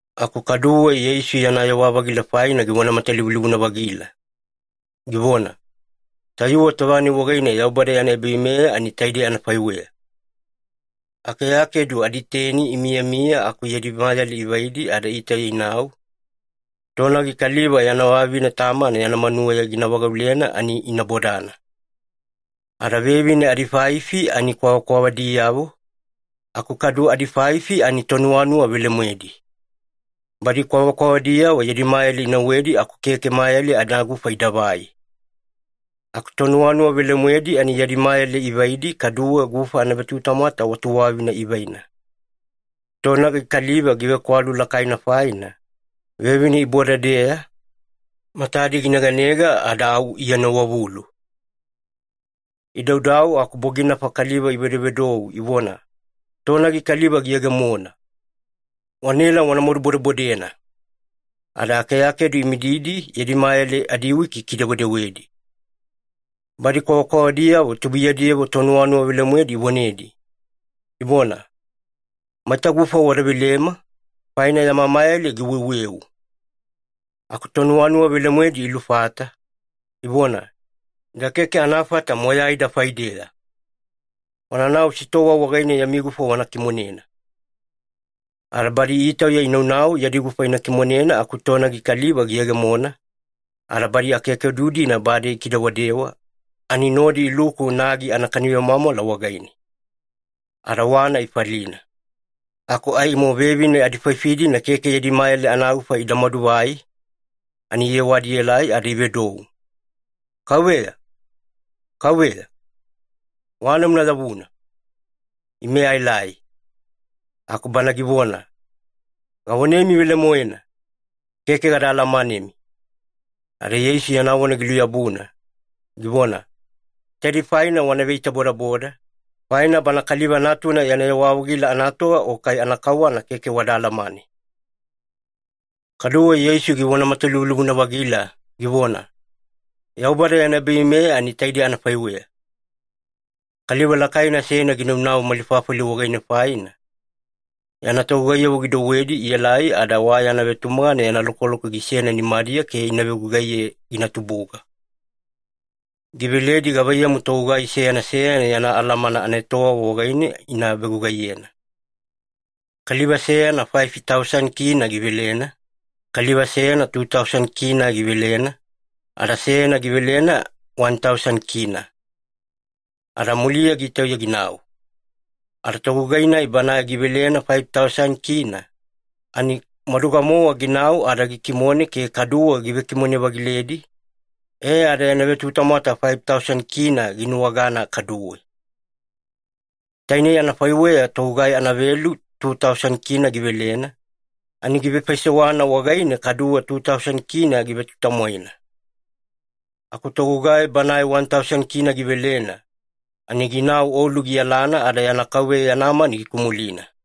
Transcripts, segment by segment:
Aku kaduwe Yeisu yana yewa-vagila faina givona matalivulivuna-vagila, givona, “Tayuwe tova-nai wagaine Yaubada yana ebaveimeya ani taidei anafaiweya. Akeakedu aditeni imiyamiya aku yadi mayale ivaidi ada itauya inau, tonagi kaliva yana vavine tamana yana manuweya gina vagaulena ani ina bodana. Ada vevine adifaifi ani kwavakwavadiyavo, aku kadu adifaifi ani tonuwanuwa velemoedi. Badi kwavakwavadiyavo yadi mayale inauwedi aku keke mayale anagufa idavai. Aku tonuwanuwa velemoedi ani yadi mayale ivaidi kaduwe gufa anavetutamwata wa tuwavina ivaina. Tonagi kaliva givekwalu lakaina faina, vevine iboda-deeya, matadi gineganega ada au ienowavulu. “Idaudau aku boginafa kaliva ivedovedou ivona, ‘Tonagi kaliva giyegemona! Wanaela wana madubodebodena.’ Ada akeakedu imididi yadi mayale adiwiki ikidewedewedi. “Badi kwavakwavadiyavo tubuiyadiyavo tonuwanuwa velemoedi ivonedi, ivona, ‘Maita gufa wada velema, faina yama mayale giweuweu.’ “Aku tonuwanuwa velemoedi ilufata, ivona, ‘Ida keke anafata moyaida faideya. Wananau sitowa wagaine yami gufa wana kimonena.’ “Ada badi itauya inaunau yadi gufa ina kimonena aku tonagi kaliva giyegemona, ada badi akeakedu-dina bade ikidewadewa, ani nodi iluku nagi anakani vemwamwala wagaine. Ada wana ifalina. Aku aimo vevine adifaifi-dina keke yadi mayale anagufa ida maduvai, ani iyewadi ielai ada ivedou, ‘Kauveya, Kauveya, wana una yavuna. Ime aelai.’ “Aku bana givona, ‘Gavonemi velemoena, keke gada alamanemi.’” Ada Yeisu yana vona giluyabuna, givona, “Taidei faina wana veitabodaboda, faina Bana Kaliva Natuna yana yewa-vagila anatova o kai anakauwana keke wada alamane.” Kaduwe Yeisu givona matalivulivuna-vagila givona, “Yaubada yana ebaveimeya ani taidei anafaiweya. Kaliva lakaina seyana ginanau mali fafali wagaine faina, yana togugaiyavo gidouwedi ielai ada wa yana vetumagana yana lokoloko gisena nimadiya ke ina vegugaiye gina tubuga. Giveledi gavaiyamu togugai seyana seyana yana alamana anaetowava wagaine ina vegugaiyena. Kaliva seyana faifi tausani kina (K5,000) givelena, kaliva seyana tu tausani kina (K2,000) givelena, ada seyana givelena wani tausani kina (K1,000). Ada muliya gitauya ginau. Ada togugai-nai banae givelena faifi tausani kina, ani maduga-mowa ginau ada gikimone ke kaduwe givekimone-vagiledi, e ada yana vetutamwata faifi tausani kina ginuwagana kaduwe. Tainei anafaiweya togugai anavelu tu tausani kina (K2,000) givelena, ani givefaisewana wagaine kaduwe tu tausani kina givetutamwaina. Aku togugai banae wani tausani kina (K1,000) givelena, ani ginau olu giyalana ada yana kauveya yana mani gikumulina.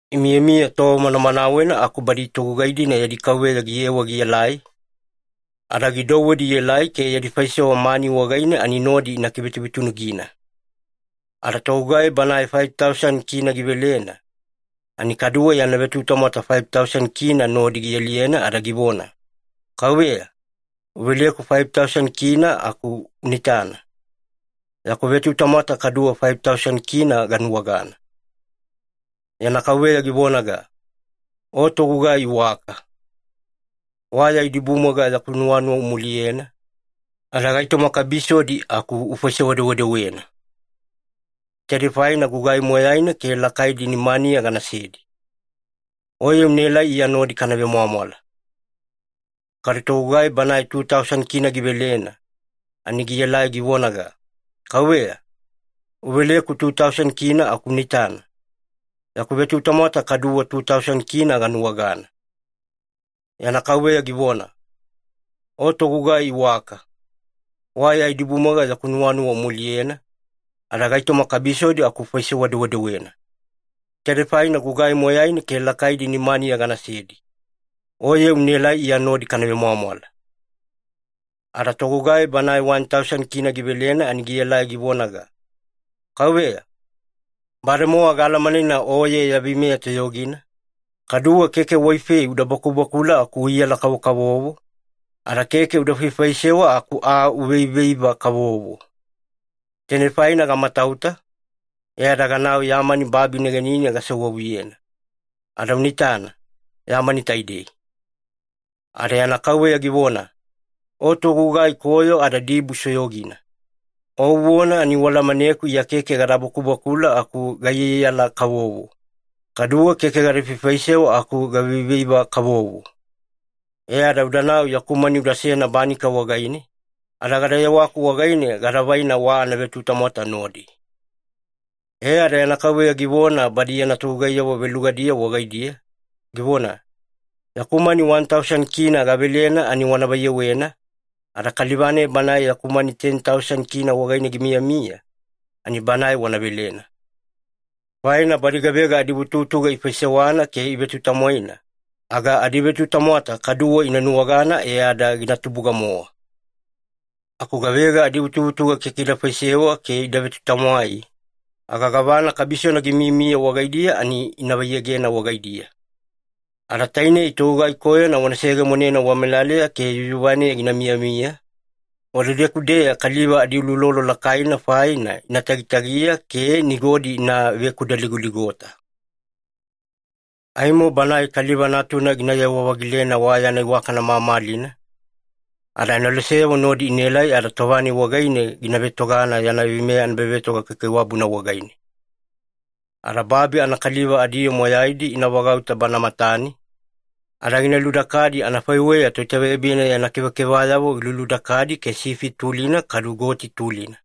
“Imiyamiya tova manamanawena aku badi togugai-dina yadi kauveya giyewa gielai, ada gidouwedi ielai ke yadi faisewa mani wagaine ani nodi ina kivetuvetunugina. Ada togugai banae faifi tausani kina (K5,000) givelena, ani kaduwe yana vetutamwata faifi tausani kina nodi gialiyena ada givona, ‘Kauveya, uveleku faifi tausani kina aku una itana, yaku vetutamwata kaduwe faifi tausani kina ganuwagana.’ “Yana kauveya givonaga, ‘O togugai iwaka! Wa ya idibumwaiga yaku nuwanuwa umuliyena, ada gaitoma kabisodi aku ufaisewa-dewedewena. Taidei faina gugai moyaina ke lakaidi nimaniya ganasedi. Oye unaelai Iya nodi kana vemwamwala.’ “Kadu togugai banae tu tausani kina (K2,000) givelena, ani gielai givonaga, ‘Kauveya, uveleku tu tausani kina aku una itana, yaku vetutamwata kaduwe tu tausani kina ganuwagana.’ “Yana kauveya givona, ‘O togugai iwaka! Wa ya idibumwaiga yaku nuwanuwa umuliyena, ada gaitoma kabisodi aku ufaisewa-dewedewena. Taidei faina gugai moyaina ke lakaidi nimaniya ganasedi. Oye unaelai Iya nodi kana vemwamwala.’ “Ada togugai banae wani tausani kina (K1,000) givelena ani gielai givonaga, ‘Kauveya, bademowa gaalamanena o ya veimeya toyogina, kaduwe keke waifei uda bakubakula aku uiyaiyala-kavovo, ada keke uda faifaisewa aku aa uveiveiva-kavovo. Tainei faina gamatauta, e ada ganau ya mani babi negenine gasewavuyena. Ada una itana, ya mani taidei.’ “Ada yana kauveya givona, ‘O togugai koyo ada dibusoyogina. O uvona ani ualamaneku Iya keke gada bakubakula aku gaiyaiyala-kavovo, kaduwe keke gada faifaisewa aku gaveiveiva-kavovo. E ada udanau yaku mani udasena banika wagaine, ada gada yewaku wagaine gada vaina wa anavetutamwata nodi.’ E ada yana kauveya givona badi yana togugaiyavo velugadiyavo wagaidiya, givona, ‘Yaku mani wani tausani kina (K1,000) gavelena ani wana vaiyewena, ada kaliva-nai banae yaku mani teni tausani kina wagaine gimiyamiya, ani banae wana velena. Faina badi gavega adivutuvutuga ivefaisewana ke ivetutamwaina, aga adivetutamwata kaduwe ina nuwagana e ada gina tubuga-mowa. Aku gavega adivutuvutuga keke ida vefaisewa ke ida vetutamwai, aga gavana kabisona gimiyamiya wagaidiya ani ina vaiyegena wagaidiya. Ada tainei togugai koyona wana seyegemonena wamelaleya ke yuyuvaneya gina miyamiya, wadedeku-deya kaliva adiuloulolo lakaina faina ina tagitagiya ke nigodi ina vekudaligoligota.’ “Aimo Banae Kaliva Natuna ginayewa-vagilena wa yana iwakana mamalina, ada aneloseyavo nodi inaelai, ada tova-nai wagaine gina vetogana yana veimeya anaebavetoga kaikaiwabuna wagaine. Ada babi anakaliva adiyoo moyaidi ina vagauta Bana matane, ada gina ludakadi anafaiweya toitaveyabina yana kevakevayavo giluludakadi ke sifi tulina kadu goti tulina.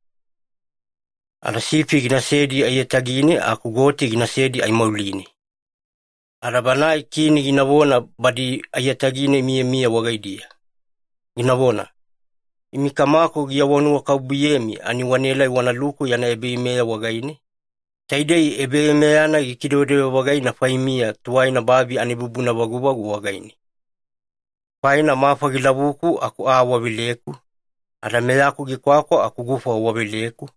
Ada sifi ginasedi aiyatagine aku goti ginasedi aimauline. Ada Banae Kini ginavona badi aiyatagine imiyamiya wagaidiya, ginavona, ‘Imi Kamaku giawanuwakabubuyemi ani wanaelai wanaluku yana ebaveimeya wagaine, taidei ebaveimeya-nai gikidewedewe-vagaina faimiya tuwaina babi anaibubuna vaguvagu wagaine. Faina mafa gilavuku aku aa waveleku, ada meyaku gikwakwa aku gufa waveleku,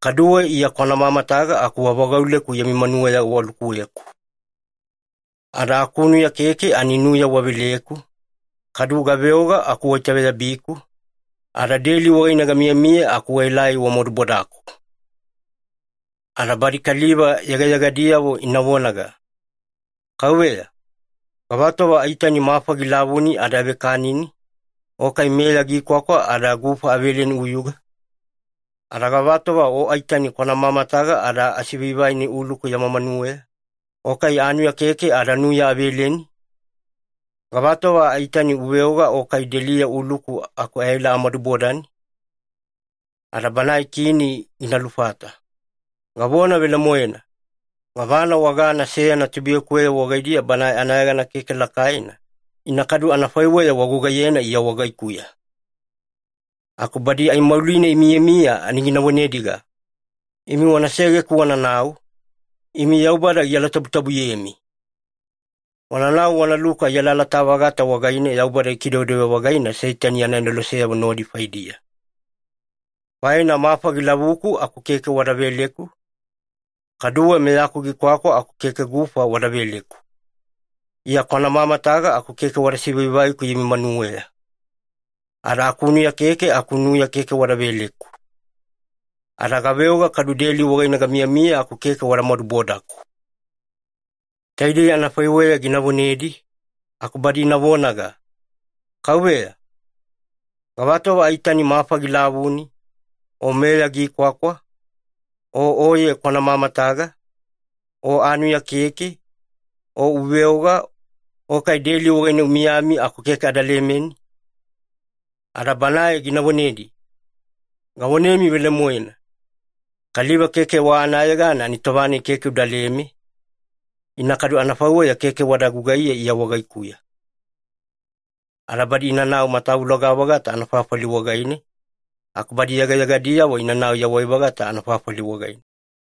kaduwe Iya kwana mamataga aku wavagauleku yami manuweya walukuweku. Ada akunuya keke ani nuya waveleku, kadu gaveoga aku waitaveyabiku, ada deli wagaine gamiyamiya aku waelai wamadubodaku.’ “Ada badi kaliva yegayegadiyavo ina vonaga, ‘Kauveya, gavatova aitani mafa gilavuni ada avekanini, o kai meya gikwakwa ada gufa aveleni uyuga? Ada gavatova o aitani kwana mamataga ada asivaivaini uluku yama manuweya, o kai anuya keke ada nuya aveleni? Gavatova aitani uveoga o kai deliya uluku aku aela amadubodani?’ “Ada Banae Kini gina lufata, ‘Gavona velemoena, gavana wagana seyana tubuiyakuweyavo wagaidiya banae anayegana keke lakaina, ina kadu anafaiweya wagugaiyena Iya wagaikuya.’ “Aku badi aimauline imiyamiya ani gina vonediga, ‘Imi wana segeku wananau, imi Yaubada gialatabutabuyemi. Wananau wanaluku ai alalata-vagata wagaine Yaubada gikidewedewe-vagaina Seitani yana aneloseyavo nodi faidiya. Faina mafa gilavuku aku keke aa wada veleku, kaduwe meyaku gikwakwa aku keke gufa wada veleku. Iya kwana mamataga aku keke wada sivaivaiku yami manuweya. Ada akunuya keke aku nuya keke wada veleku. Ada gaveoga kadu deli wagaine gamiyamiya aku keke wada madubodaku.’ “Taidei anafaiweya gina vonedi, aku badi ina vonaga, ‘Kauveya, gavatova aitani mafa gilavuni, o meya gikwakwa, o oye kwana mamataga, o anuya keke, o uveoga, o kai deli wagaine umiyami aku keke ada lemeni?’ “Ada banae gina vonedi, ‘Gavonemi velemoena, kaliva keke wa anayegana ani tova-nai keke udaleme, ina kadu anafaiweya keke wada gugaiye Iya wagaikuya.’ Ada badi inanau matavuloga-vagata anafafali wagaine, aku badi yegayegadiyavo inanau yawai-vagata anafafali wagaine.”